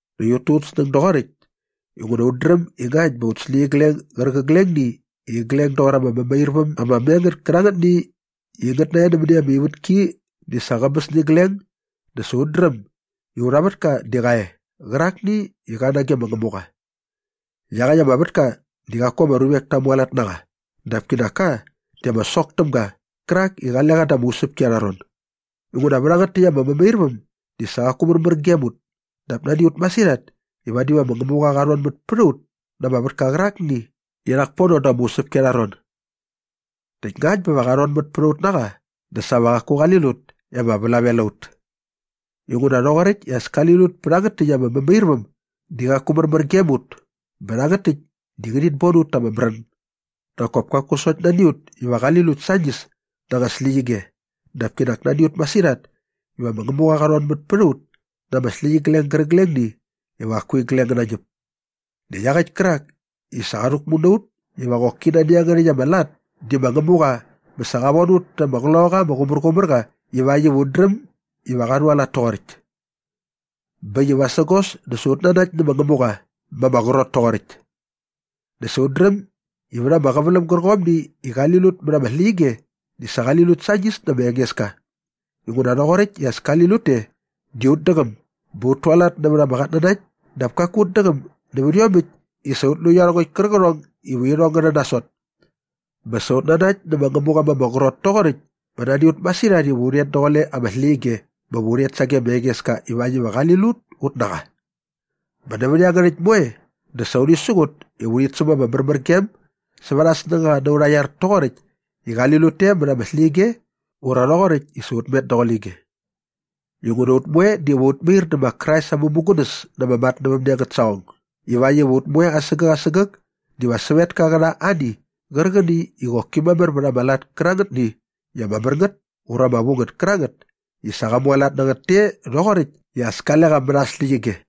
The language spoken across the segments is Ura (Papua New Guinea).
Näkt ut tu ut snäng doqoräkt inguna ut dräm i ngakt bä aut släqyigleng gärqiglengni i igleng doqor ama mämairväm ama me ngät kärangätni i ngät narhe nämäni ama ivätki di sa qäbäs nä igleng dä sa ut dräm i aurha vätka di qa e qärakni i qa nage ma Ngämuqa. Iaqäkt ama vätka di qaku ama ruvek ta mualat na qa dap kinak ka di ama sok täm ga qärak i qale qa da ama usäpki arha ron. Inguna vä rhangät täkt ama mämairväm di sa qaku märmär gem ut dap nani a ut masirhat i vadi va ma Ngämuqa qa rhonmät pät a ut na ama vätka qärakni i rhak pono da ama usäpki arha ron. Näkt ngakt bä va qa rhonmät pät a ut na qa dä sa va qaku qali lut i ama vlavel a ut. Inguna rhoqoräkt i as kali lut pä rhangät täkt ama mämairväm di qaku märmär gem ut bä rhangät täkt di ngärhit bon ut ta ama märän. Nak kop kaku sokt nani a ut iva qali lut sañis na anga släqyige dap kinak nani a ut masirhat iva ma Ngämuqa qa rhonmät pät a ut na ama släqyigleng gärqiglengni iva qaku igleng ngä nañäp. Näkt iaqäkt kärak i sa qa rhäkmu na ut iva qoki nani iangärhäkt ama lat di ma Ngämuqa bä sa qa von ut ta ama Qloqaqa ama Qumärqumärqa ivakt iva ut dräm iva qa rhualat toqoräkt. Bä äkt i vasägos dä sa ut nanakt nä ma Ngämuqa ma ama qrot toqoräkt. Näkt sa ut dräm i vät ama qäväläm gärqomni i qali lut mät ama släqyige di sa qali lut sañis nä ma Engeska inguna rhoqoräkt i as kali lut te di ut däqäm bä ut tualat nävät ama qatnanakt dap kaku ut däqäm nävät iomäkt i sa ut lu iarhongäkt kärqärhong iva irhong ngä rhän nasot. Bä sa ut nanakt nä ma Ngämuqa ma ama qrot toqoräkt bä nani a ut masirhat iva u rhet daqule ama släqyige bä va u rhet sage ma Engeska ivakt iva qali lut ut na qa. Bä nävät iangärhäkt moe dä sa urhi siqut iva urhit säm ama märmärgem sävät aa snängaqa na aurha iar toqoräkt i qali lut te mät ama släqyige ura rhoqoräkt i sa ut met daqule ige. Inguna ut moe diva ut mair dä ma Krais aa mämugunäs na ama matnävämne angät saqong ivakt iva ut moe asägäk asägäk diva sävetka qä rha ani qärqäni i qoki mamär vät ama lat kärangätni i ama mär ngät ura ama vu ngät kärangät i sa qa mualat na ngät te rhoqoräkt i as kale qa mät aa släqyige.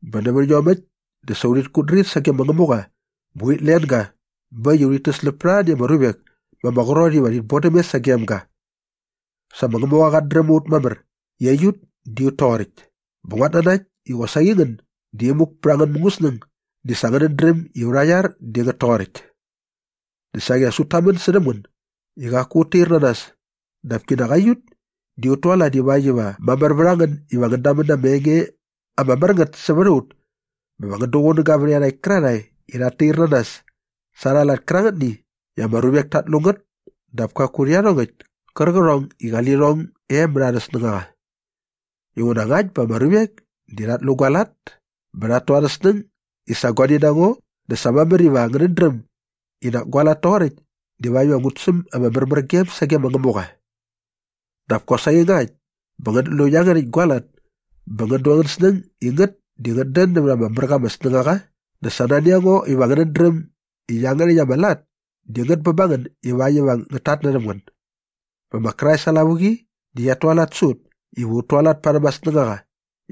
Bä nävät iomäkt dä sa urhit kutdrir sage ma Ngämuqa bä urhit len ga bä äkt i urhit täsläp pät arhani ama ruvek ma ama qrot iva rhi vodäm mes sagem ga. Sa ma Ngämuqa qat dräm a ut mamär i aiut di ut toqoräkt bä nguat nanakt i qosaqi ngän di imuk pät angän mungäsnäng di sa ngänät dräm i aurha iar di ngät toqoräkt. Näkt saqi as ut tamän särhäm ngän i qaku ut tair na nas dap kinak aiut di ut tualat ivakt iva mamär vät a ngän iva ngän damän na ama enge ama mär ngät sävät a ut bä va ngän duqunäga vät iarhakt kärarhae i rhat tair na nas sa arha lat kärangätni i ama ruvek tat lu ngät dap kaku rhä iarhongäkt kärqärhong i qali lirhong e mät arhä snängaqa. Inguna ngakt bä ama ruvek di rhat lu gua lat bä rhat tu arhä snäng i sa guani na ngo dä sa mamär iva ngänät dräm i nak gua lat toqoräkt divakt iva ngut säm ama märmärgem sage Ngämuqa. Dap kosaqi ngakt bä ngänät lu iangärhäkt gua lat bä ngän du angän snäng i ngät di ngät dän nävät ama mär qa ama snängaqa dä sa nani a ngo iva ngänät dräm i iangärhäkt ama lat di ngät bä ba ngän ivakt iva ngät tatnärhäm ngän. Bä ma Krais aa lavuqi di qiat tualat sä ut iva ut tualat parhäm aa snängaqa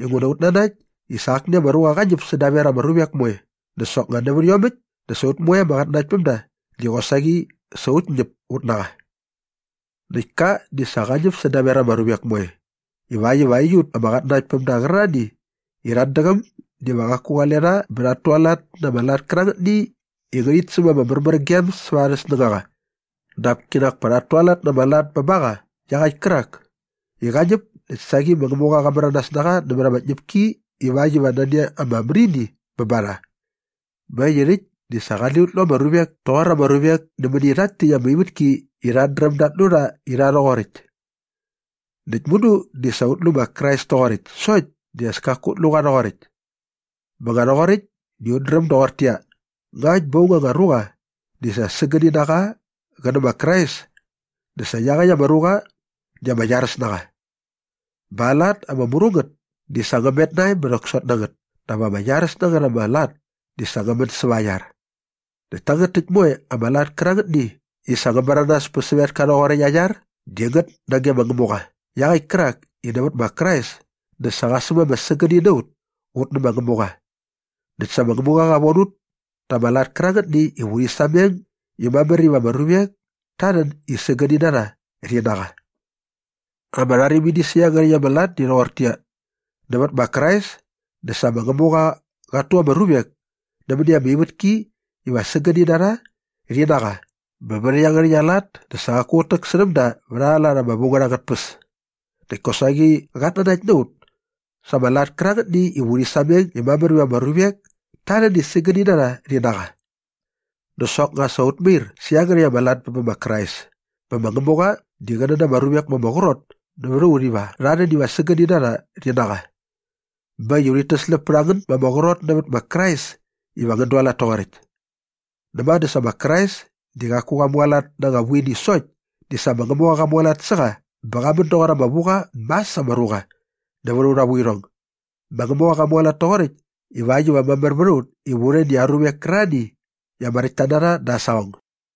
inguna ut nanakt i sa akni ama ruqa qa ñäp sädaver ama ruvek moe dä soknga nävät iomäkt dä sa ut moe ama qatnanaktpämda di qosaqi sa ut ñäp ut na qa. Näkt ka di sa qa ñäp sädaver ama ruvek moe ivakt iva aiut ama qatnanaktpämda qärarhani i rhat däqäm diva qaku qale rha bä rhat tualat na ama lat kärangätni iva ngärhit säm ama märmärgem säva arhä snängaqa dap kinak pa rhat tualat na ama lat bä ba qa iaqäkt kärak i qa ñäp näkt saqi ma Ngämuqa qa märanas na qa nämät ama tñäpki ivakt iva nani ama märini bä ba rha. Bä äkt i rhäkt di sa qale ut lu ama ruvek toqor ama ruvek nämäni rhakt täkt ama ivätki i rhat dräm dat lu rha i rha rhoqoräkt. Näkt mudu di sa ut lu ma Krais toqoräkt sokt di as kaku ut lu qa rhoqoräkt. Bä nga rhoqoräkt di ut dräm doqortäqyia, ngakt bä aung anga ruqa di sa sägäni na qa qä nä ma Krais dä sa iaqäkt ama ruqa di ama iaräs na qa. Bä aa lat ama mru ngät di sa ngä met nae bä rhäksot na ngät dap ama iaräs na ngät ama lat di sa ngä män säva aa iar. Näkt tangät täkt moe ama lat kärangätni i sa ngä märanas pä sävetka rhoqoräkt aa iar di ngät nage ma Ngämuqa iaqäkt kärak i nävät ma Krais dä sa qa säm ama sägäni na ut ut nä ma Ngämuqa. Näkt sa ma Ngämuqa qa von ut ta ama lat kärangätni iva urhi sameng i mamär iva ama ruvek ta rhän i sägäni na rha rhi na qa. Ama rharimini sä iangärhäkt ama lat di rhoqortäqyia, nävät ma Krais dä sa ma Ngämuqa qat tu ama ruvek nämäni ama ivätki iva sägäni na rha rhi na qa bä vät iangärhäkt aa lat dä sa qaku qät täksärhäm da vät arha lat ama vu ngät angät tpäs näkt kosaqi qat nanakt na ut sa ama lat kärangätni iva urhi sameng i mamär iva ama ruvek ta rhän i sägäni na rha rhi na qa. Dä soknga sa ut mair sä iangärhäkt ama lat bä bä ma Krais bä ma Ngämuqa di qä nän ama ruvek ma ama qrot nävät a ut iva rha rhän iva sägäni na rha rhi na qa. Bä äkt i urhit täsläp pät a ngän ma ama qrot nävät ma Krais iva ngän dualat toqoräkt. Näma dä sa ma Krais di qaku qa mualat na anga vuini sokt di sa ma Ngämuqa qa mualat sä qa bä qa män doqor ama vu qa mas ama ruqa nävät aurha vuirhong. Ma Ngämuqa qa mualat toqoräkt ivakt iva mamär vät a ut iva u rhän i aa ruvek kärarhani i ama räktta na rha da aa saqong.